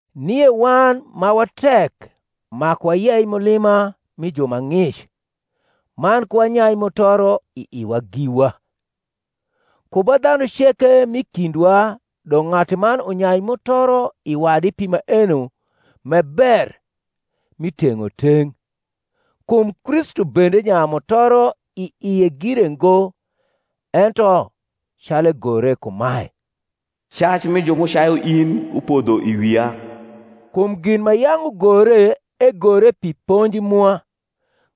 Nie wan ma wa tek maku wayei mulima mi ju ma ng’ic, man ku wanyai mutoro i iwa giwa. Ku ba dhanu ceke m’i kindwa dong’ ng’atuman unyai mutoro i wadi pi maeno m’e ber, mi teng’oteng’. Kum Kristu bende nyayu mutoro i ie gire ngo; ento, calu egore kumae, Cac mi ju m’ucayu in upodho i wia. Kum gin ma yang’ ugore egore pi ponji mwa,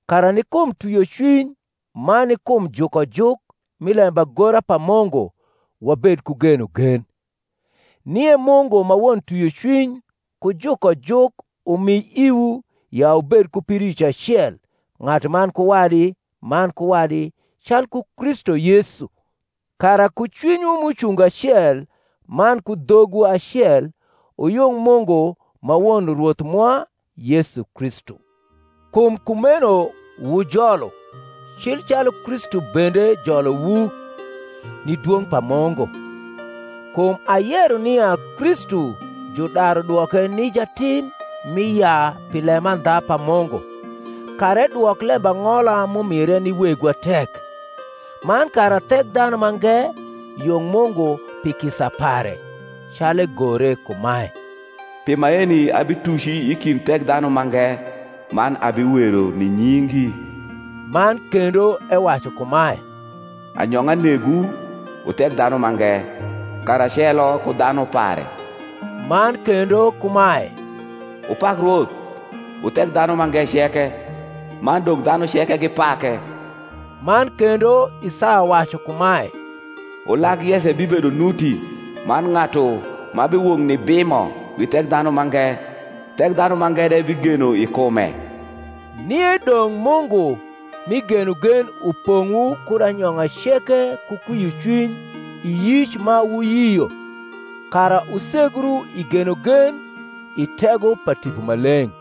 kara ni kum twiocwiny man ni kum jukojuk mi lembagora pa Munguwabed ku genogen. Nie Mungu ma won twiocwiny ku jukojuk umi iwu ya wubed ku pidoic acel ng’atuman ku wadi man ku wadi calku Kristu Yesu: kara ku cwinywu m’ucungo acel man ku dhogwu acel wuyung Mungu ma won Rwoth mwa Yesu Kristu. Kum kumeno wujolu, cil calu Kristu bende jolowu, ni dwong’ pa Mungu. Kum ayero nia Kristu judaru dwoke ni jatim mi yaa pi lemandha pa Mungu, kara edwok lembang’ola m’umire ni wegwa tek, man kara Thekdhanumange yung Mungu pi kisa pare; calu egore kumae, Pi maeni abituci i kind Thekdhanu mange, Man abiwero ni nyingi. Man kendo ewacu kumae, Anyong’a negwu, wu Thekdhanumange, karacelo ku dhanu pare. Man kendo kumae, Wupak Rwoth, wu Thekdhanumange ceke; Man dong’ dhanu ceke gipake. Man kendo, Isaya wacu kumae, Ulag Yese bibedo nuti, Man ng’atu ma biwok nibimo wi Thekdhanumange; Thekdhanumange de bigeno i kume. Nie dong’ Mungu mi genogen upong’wu kud anyong’a ceke ku kwiocwiny i yic ma wuyio, kara wusegru i genogen, i tego pa Tipo Maleng’.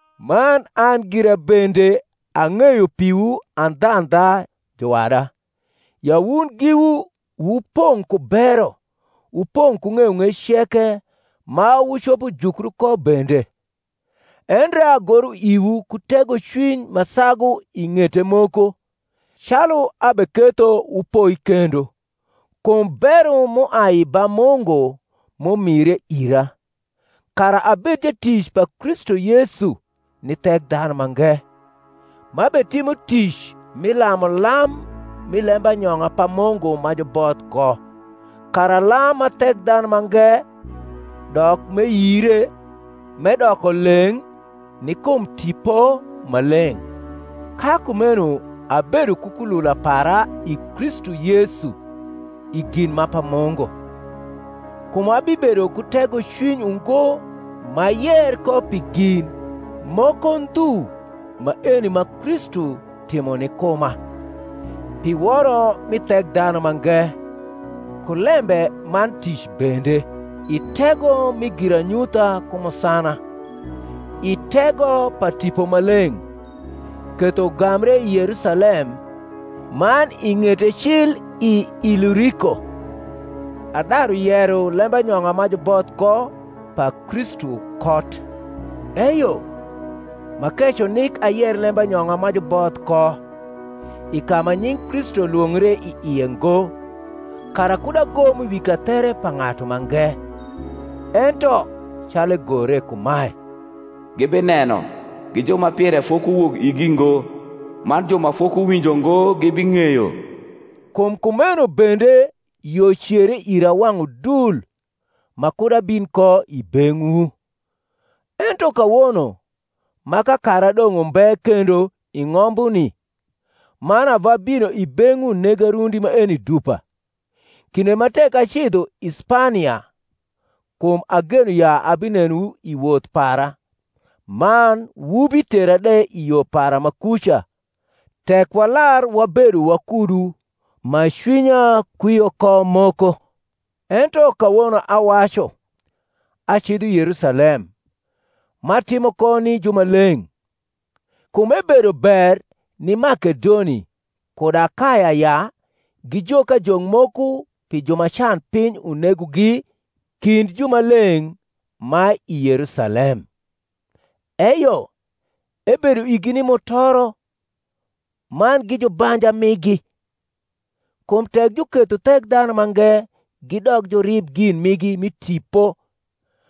Man an gira bende ang’eyo piwu andhandha, juwada, ya wun giwu wupong’ ku bero, wupong’ ku ng’eyong’ec ceke, ma wucopo jukru ko bende. Endre agoro iwu ku tegocwiny ma sagu i ng’ete moko, calu abeketho wupoi kendo, kum bero m’uai ba Mungu m’umire ira, kara abed jatic pa Kristu Yesu ni Thekdhanumange, m’abetimo tic mi lamulam mi lembanyong’a pa Mungu ma juboth ko, kara lam ma Thekdhanumange dok m’eyire, m’edoko leng’ ni kum Tipo Maleng’. Ka kumeno abedo ku kulula para i Kristu Yesu i gin ma pa Mungu. Kum abibedo ku tegocwiny ungo m’ayer ko pi gin moko ndhu maeni ma Kristu timo ni kuma, pi woro mi Thekdhanumange, ku lembe man tic bende, i tego mi giranyutha ku musana, i tego pa Tipo Maleng’; ketho ugambre i Yerusalem, man i ng’ete cil i Iluriko, adaru yero lembanyong’a ma juboth ko pa Kristu kot; eyo, m’akeco nik ayer lembanyong’a ma juboth ko, i ka ma nying’ Kristu lwongre i ie ngo, kara kud agom wi kathere pa ng’atu mange; ento, calu egore kumae, Gibineno, gi ju ma pire fokuwok igi ngo, Man ju ma fokuwinjo ngo gibing’eyo. Kum kumeno bende yo cere ira wang’ udul ma kud abin ko i beng’wu: ento kawono, ma kakara dong’ umbe kendo i ng’ombuni, man ava bino i beng’wu nega rundi maeni dupa, kinde ma tek acidho i Spania (kum ageno ya abinenowu i woth para, man wubitera de i yo para ma kuca, tek walar wabedo wakudu ma cwinya kwio ko moko), ento kawono awacu, acidho Yerusalem, m’atimo ko ni jumaleng’. Kum ebedo ber ni Makedoni kud Akaya ya gijok ajok moko pi ju ma canpiny unegogi kind jumaleng’ ma i Yerusalem. Eyo, ebedo igi ni mutoro; man gi jubanja migi. Kum tek juketho Thekdhanumange gidok jurib gin migi mi tipo,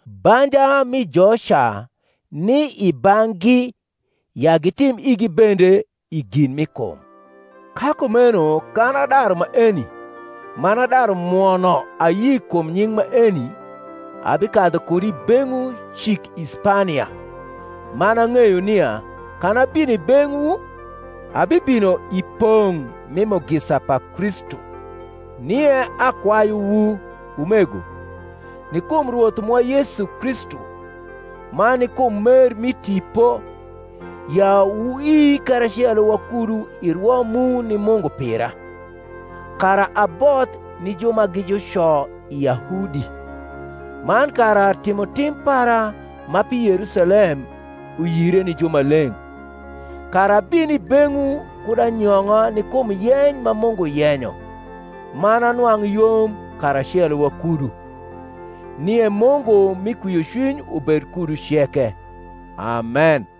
banja mi joca ni i bang’gi ya gitim igi bende i gin mi kum. Ka kumeno kan adaru maeni, man adaru mwono ayi kum nying’ maeni, abikadhu kud i beng’wu cik i Spania. Man ang’eyo nia, kan abino i beng’wu, abibino i pong’ mi mugisa pa Kristu. Nie akwayuwu, umego, ni kum Rwoth mwa Yesu Kristu, man ni kum mer mi Tipo, ya wuii karacelo wakudu i rwo mu ni Mungu pira; kara aboth ni ju ma gi juco i Yahudi, man kara timotim para ma pi Yerusalem uyire ni jumaleng’; kara abin i beng’wu kud anyong’a ni kum yeny ma Mungu yenyo, man anwang’ yom karacelo wakudu. Nie Mungu mi kwiocwiny ubed kudu ceke. Amen.